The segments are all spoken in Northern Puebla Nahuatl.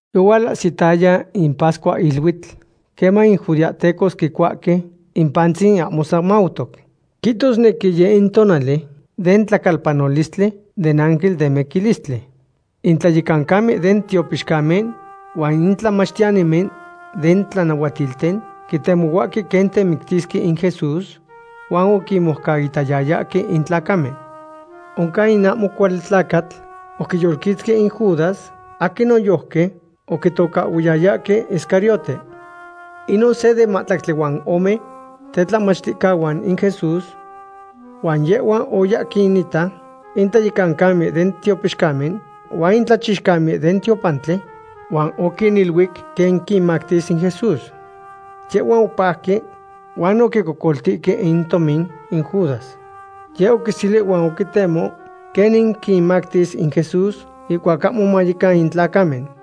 Yohualahsitaya in pascuahiluitl queman in judeahtecos quicuahque in pantzin ahmo semautoc. Quitosnequi yeh in tonali den tlacalpanolistli den ángel den miquilistli. In tlayecancamen den tiopixcamen huan in tlamachtiyanimen den tlanahuatilten quitemohuahque quen temictisque in Jesús, huan oquinmojcaitayayahque in tlacamen. Oncan in ahmo cuali tlacatl oquiyolquitzqui in Judas, aquin noyojqui oquitocahhuiyayahque Iscariote. Inon se den mahtlactli huan ome tetlamachticahuan in Jesús. Huan yehhua oya quinita in tlayecancamen den tiopixcamen, huan in tlachixcamen den tiopantli, huan oquiniluic quen quinmactis in Jesús. Yehhuan opajque huan oquicocoltihque in tomin in Judas. Yehhua oquiseli huan oquitemo quenin quinmactis in Jesús ihcuac ahmo mayecan in tlacamen.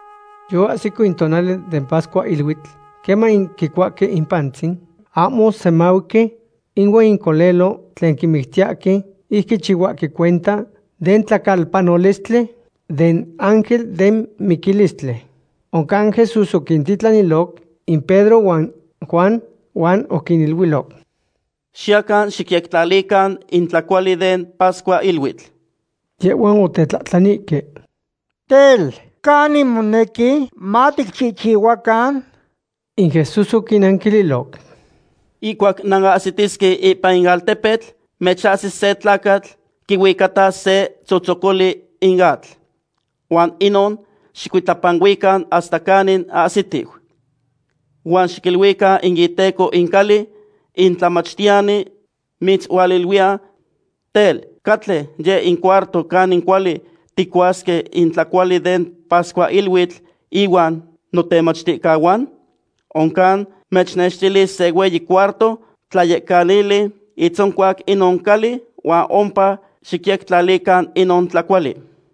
Yoahsico in tonali den pascuahiluitl queman quicuahque in pantzin ahmo semauqui ihuan in colelo tlen quimictiyahque ic quichihuahque cuenta den tlacalpanolistli den ángel den miquilistli. Oncan Jesús oquintitlaniloc in Pedro huan Juan, huan oquiniluiloc: ―Xiyacan xicyectlalican in tlacuali den pascuahiluitl. Yehhuan otetlahtlanihque: ―Tel, ¿canin monequi maticchihchihuacan? In Jesús oquinnanquililoc: ―Ihcuac nanahsitisque ipan in altepetl, mechahsis se tlacatl quihuicatas se tzotzocoli in atl. Huan inon xicuitlapanuican hasta canin ahsitiu. Huan xiquiluican in iteco in cali: “In Tlamachtiyani mitzualiluiya: Tel, ¿catle yeh in cuarto canin cuali ticuasque in tlacuali den pascuahiluitl ihuan notemachticahuan?” Oncan mechnextilis se hueyi cuarto tlayectlalili itzoncuac inon cali huan ompa xicyectlalican inon tlacuali.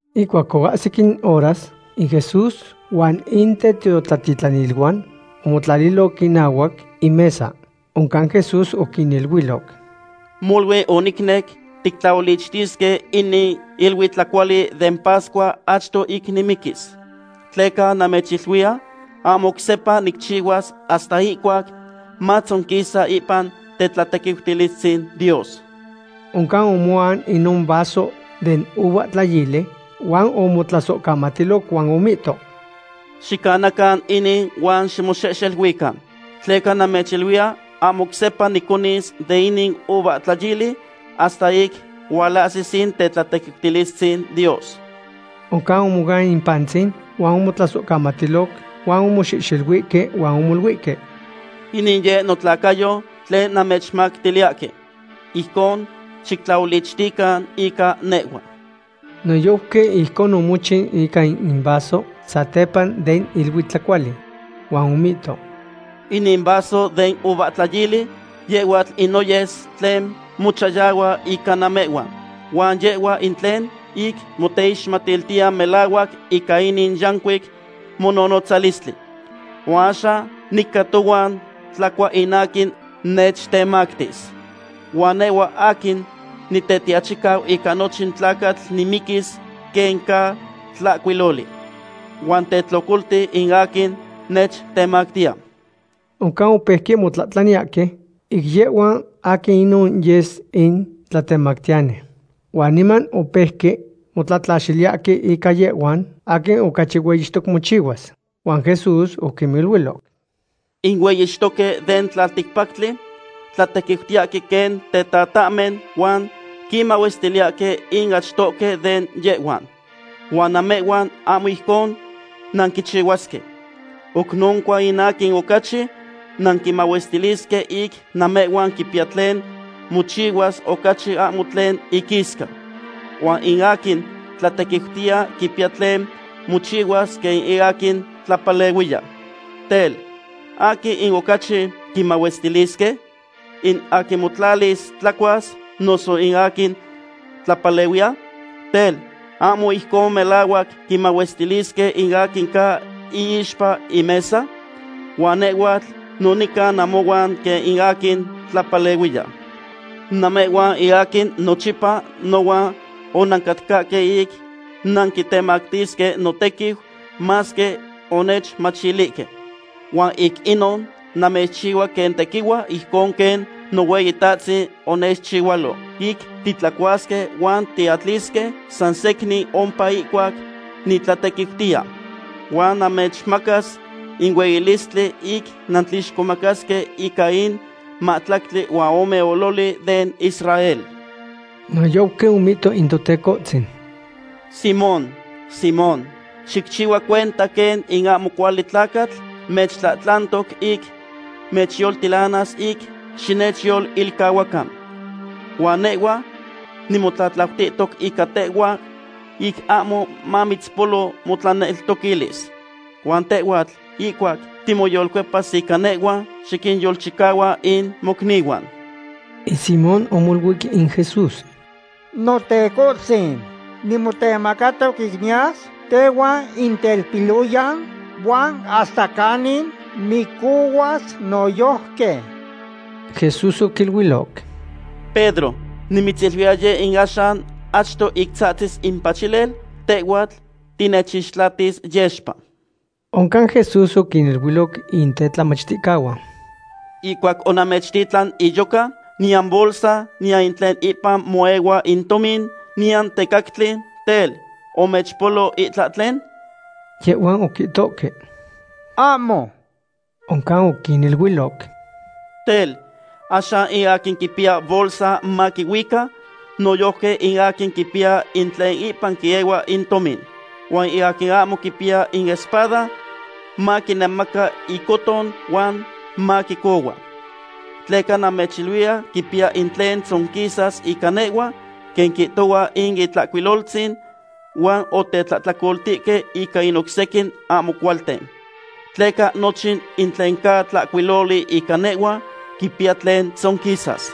Ihcuac oahsic in horas, in Jesús huan in tetiotlatitlaniluan omotlaliloc inahuac in mesa. Oncan Jesús oquiniluiloc: ―Molui onicnec tictlaolichtisque inin iluitlacuali den pascua achto ic nimiquis. Tleca namechiluiya ahmo oc sepa nicchihuas hasta ihcuac matzonquisa ipan tetlatequiutilistzin Dios. Oncan omoan inon vaso den uvahtlayili huan omotlasohcamatiloc huan omihto: ―Xicanacan inin huan ximoxehxeluican. Tleca namechiluiya ahmo oc sepa niconis de inin uvahtlayili hasta ic hualahsis in tetlatequiutilistzin Dios. Oncan omoan in pantzin huan omotlasohcamatiloc huan omoxehxeluihque huan omoluihque: ―Inin yeh notlacayo tlen namechmactiliyahque. Ijcon xictlaolichtican ica nehhua. Noyojqui ijcon omochiu ica in vaso satepa den iluitlacuali. Huan omihto: ―Inin vaso den uvahtlayili yehhuatl in noyes tlen mochayahua ica namehhuan, huan yehhua in tlen ic moteixmatiltiya melahuac ica inin yancuic mononotzalistli. ’Huan axan nica tohuan tlacua in aquin nechtemactis. Huan nehhua aquin Nitetiachicau ica nochin tlacatl nimiquis quen ca tlahcuiloli. ¡Huan tetlocolti in aquin nechtemactiya! Oncan opeuque motlahtlaniyahque ic yehhuan aquin inon yes in tlatemactiyani. Huan niman opeuque motlatlaxiliyahque ica yehhuan aquin ocachi hueyixtoc mochihuas. Huan Jesús oquiniluiloc: ―In hueyixtoque den tlalticpactli tlatequiutiyahque quen tetatahmen huan quinmahuestiliyahque in achtohque de yehhuan. Huan namehhuan ahmo ijcon nanquichihuasque. Oc noncua in aquin ocachi nanquimahuestilisque ic namehhuan quipiya tlen mochihuas ocachi ahmo tlen iquisca. Huan in aquin tlatequiutiya quipiya tlen mochihuas quen in aquin tlapalehuiya. Tel, ¿aquin in ocachi quimahuestilisque? ¿In aquin motlalis tlacuas, noso in aquin tlapalehuiya? Tel, ¿ahmo ijcon melahuac quimahuestilisque in aquin ca iixpa in mesa? Huan nehhuatl no nica namohuan quen in aquin tlapalehuiya. ’Namehhuan in aquin nochipa nohuan onancatcahque ic nanquitemactisque notequiu, masque onechmachilihque. Huan ic inon namechchihua quen tequihua ijcon quen Nohueyitahtzin onechchihualo, ic titlacuasque huan tiatlisque sansecnin ompa ihcuac nitlatequiutiya. Huan namechmacas in hueyilistli ic nantlixcomacasque ica in mahtlactli huan ome ololi den Israel. Noyojqui omihto in Totecohtzin: ―Simón, Simón, xicchihua cuenta quen in ahmo cuali tlacatl mechtlahtlantoc ic mechyoltilanas ic xinechyolilcahuacan. Huan nehhua nimotlaitlanihtoc ica tehhua ic ahmo mamitzpolo motlaneltoquilis. Huan tehhuatl, ihcuac timoyolcuepas ica nehhua, xiquinyolchicahua in mocnihuan. In Simón omoluic in Jesús: ―Notecohtzin, nimotemacatoc ic niyas tehuan in telpiloyan huan hasta canin micohuas noyojqui. Jesús oquiluiloc: ―Pedro; nimitziluiya yeh in axan achto ic tzahtzis in pachilel, tehhuatl tinechixtlatis yexpa. Oncan Jesús oquiniluiloc in tetlamachticahuan: ―Ihcuac onamechtitlan iyoca, niyan bolsa, niyan in tlen ipan moehua in tomin, niyan tecactli; tel, ¿omechpolo itlahtlen? Yehhuan oquihtohque: ―Ahmo. Oncan oquiniluiloc: ―Tel, axan in aquin quipiya bolsa maquihuica, noyojqui in aquin quipiya in tlen ipan quiehua in tomin. Huan in aquin ahmo quipiya in espada, maquinemaca icóton huan maquicohua. Tleca namechiluiya quipiya tlen tzonquisas ica nehhua, quen quihtohua in Itlahcuiloltzin: “Huan otetlahtlacoltihque ica in oc sequin ahmo cualten.” Tleca nochin in tlen ca tlahcuiloli ica nehhua quipiya tlen tzonquisas.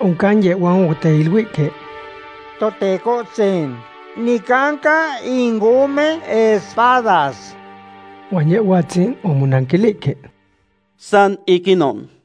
Oncan yehhuan oteiluihque: ―Totecohtzin, nicanca in ome espadas. Huan Yehhuatzin omonanquilihque: ―San ic inon.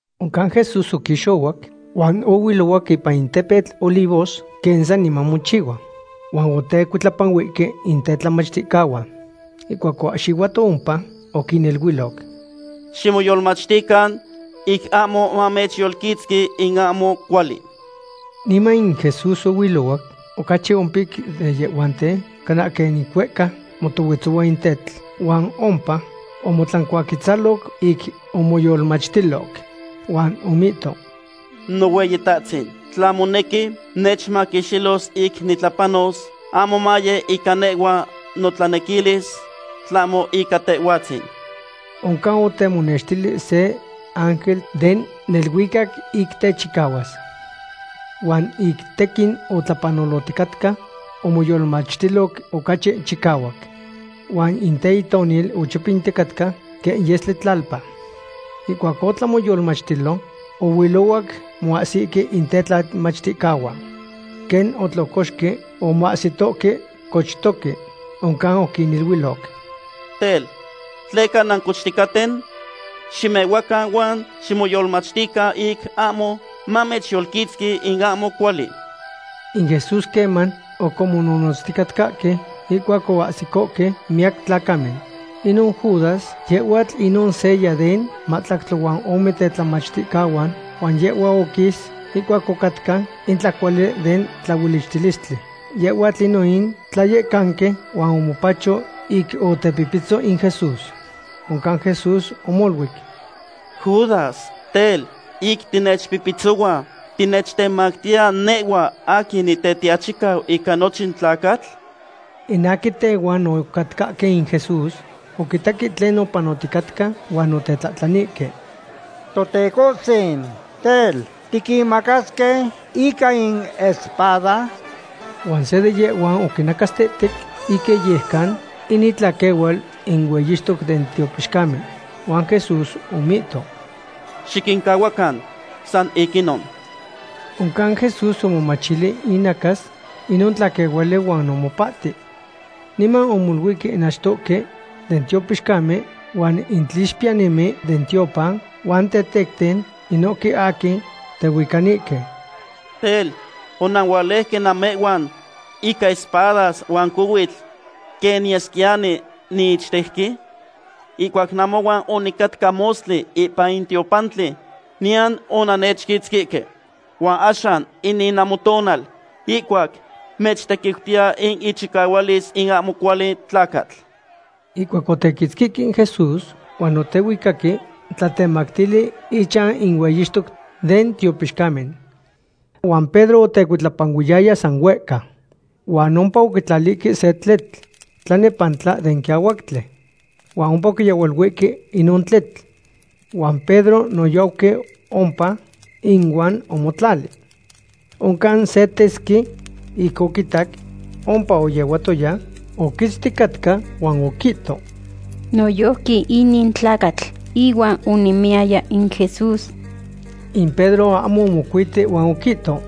Oncan Jesús oquixohuac huan ohuilohuac ipan in tepetl Olivos quen saniman mochihua. Huan otecuitlapanuihque in tetlamachticahuan. Ihcuac oahxihuato ompa, oquiniluiloc: ―Ximoyolmachtican ic ahmo mamechyolquitzqui in ahmo cuali. Niman in Jesús ohuilohuac ocachi ompic de yehhuanten cana quen ic huehca motohuetzohua in tetl, huan ompa omotlancuaquetzaloc ic omoyolmachtiloc. Huan omihto: ―Nohueyitahtzin, tla monequi, nechmaquixtilos ic nitlapanos; ahmo maye ica nehhua notlanequilis, tlahmo ica Tehhuatzin. Oncan otemonextili se ángel den neluicac ic techicahuas. Huan ic tequin otlapanoloticatca, omoyolmachtiloc ocachi chicahuac. Huan in teitonil ochopinticatca quen yestli tlalpa. Ihcuac otlan moyolmachtilo ohuilohuac moahsihque in tetlamachticahuan. Quen otlocoxque, omahsitohque cochtoque. Oncan oquiniluiloc: ―Tel, ¿tleca nancochticaten? Ximehuacan huan ximoyolmachtican ic ahmo mamechyolquitzqui in ahmo cuali. In Jesús queman oc omononotzticatcahque ihcuac oahsicohque miyac tlacamen. Inon Judas, yehhuatl inon seya den mahtlactli huan ome tetlamachticahuan, huan yehhua oquis ihcuac ocatca in tlacuali den tlaolichtilistli. Yehhuatl inon in tlayecanqui huan omopacho ic otepipitzo in Jesús. Oncan Jesús omoluic: ―Judas, tel, ¿ic tinechpihpitzohua, tinechtemactiya nehhua aquin Nitetiachicau ica nochin tlacatl? In aquin tehuan ocatcahque in Jesús oquitaque tlen opanoticatca, huan otetlahtlanihque: ―Totecohtzin, tel, ¿tiquinmacasque ica in espada? Huan se de yehhuan oquinacastehtec ic iyejcan in itlaquehual in hueyixtoc den tiopixcamen. Huan Jesús omihto: ―Xiquincahuacan, san ic inon. Oncan Jesús omomachili inacas inon tlaquehuali huan omopahti. Niman omoluihque in achtohque den tiopixcamen huan in tlixpiyanimen den tiopan huan in tetecten, inohque aquin tehuicanihque: ―Tel, ¿onanualejque namehhuan ica espadas huan cohuitl quen niyesquiyani niichtejqui? Ihcuac namohuan onicatca mostli ipan in tiopantli, niyan onannechquitzquihque. Huan axan inin namotonal, ihcuac mechtequiutiya in ichicahualis in ahmo cuali tlacatl. Ihcuac otequitzquihque in Jesús, huan otehuicaque tlatemactili ichan in hueyixtoc den tiopixcamen. Huan Pedro otecuitlapanuiyaya san huehca. Huan ompa oquitlalihque se tletl tlanepantla den quiahuactli. Huan ompa oquiyehualuihque inon tletl. Huan Pedro noyojqui ompa inuan omotlali. Oncan se tesqui ic oquitac ompa oyehuatoya, oquitzticatca huan oquihto: ―Noyojqui inin tlacatl ihuan onemiyaya in Jesús. In Pedro ahmo omocuiti huan oquihto: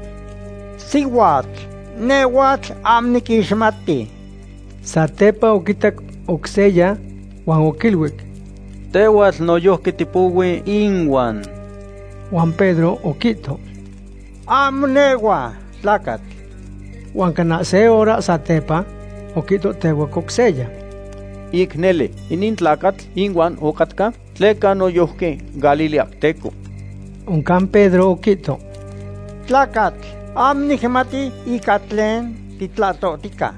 ―Sihuatl, nehhuatl ahmo niquixmati. Satepa oquitac oc seya huan oquiluic: ―Tehhuatl noyojqui tipohui inuan. Huan Pedro oquihto: ―Ahmo nehhua, tlacatl. Huan cana se hora satepa, oquihtohtehuac oc seya: ―Ic nele, inin tlacatl ihuan ocatca, tleca noyojqui galileahteco. Oncan Pedro oquihto: ―Tlacatl, ahmo nicmati ica tlen titlahtohtica.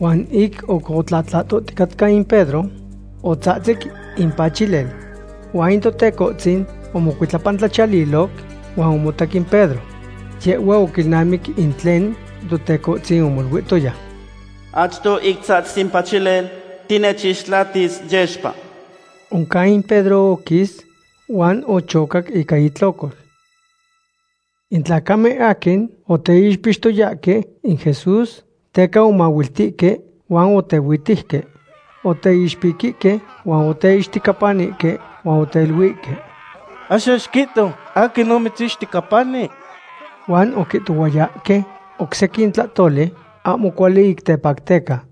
Huan ic oc otlahtohticatca in Pedro, otzahtzic in pachilel. Huan in Totecohtzin omocuitlapantlachiyaliloc huan omotac in Pedro. Yehhua oquilnamic in tlen Totecohtzin omoluihtoya: “Achto ic tzahtzis in pachilel, tinechixtlatis yexpa.” Oncan in Pedro oquis huan ochocac ica itlocol. In tlacamen aquin oteixpixtoyahque in Jesús teca omahuiltihque huan otehuihhuitejque. Oteixpiquihque huan oteixtecapanihque, huan oteiluihque: ―¡Axan xiquihto aquin omitzixtecapani! Huan oquihtohuayahque oc sequin tlahtoli ahmo cuali ic tepacteca.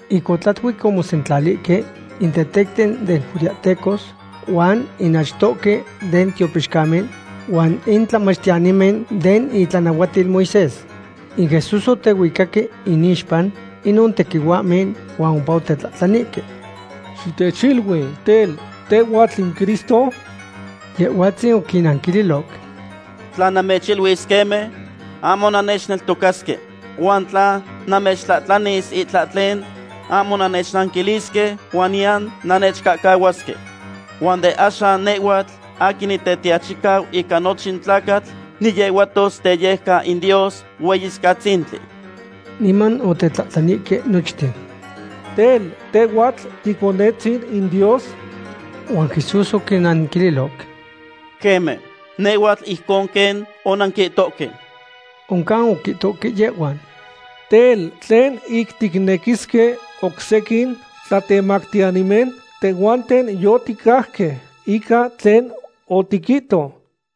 Ic otlatuic omosentlalihque in tetecten den judeahtecos huan in achtohque den tiopixcamen huan in tlamachtiyanimen den itlanahuatil Moisés. In Jesús otehuicaque inixpa inon tequihuahmen huan ompa otetlahtlanihque: ―Xitechilui, tel, ¿tehhuatl in Cristo? Yehhuatzin oquinnanquililoc: ―Tla namechiluis queme, ahmo nannechneltocasque. Huan tla namechtlahtlanis itlahtlen, ahmo nannechnanquilisque huan niyan nannechcahcahuasque. Huan de axan nehhuatl aquin Nitetiachicau ica nochin tlacatl niyehuatos teyejcan in Dios Hueyicatzintli. Niman otetlahtlanihque nochten: ―Tel, ¿tehhuatl Ticonetzin in Dios? Huan Jesús oquinnanquililoc: ―Queme, nehhuatl ijcon quen onanquihtohque. Oncan oquihtohque yehhuan: ―Tel, ¿tlen ic ticnequisque oc sequin tlatemactiyanimen? Tehhuanten yoticajque ica tlen otiquihto.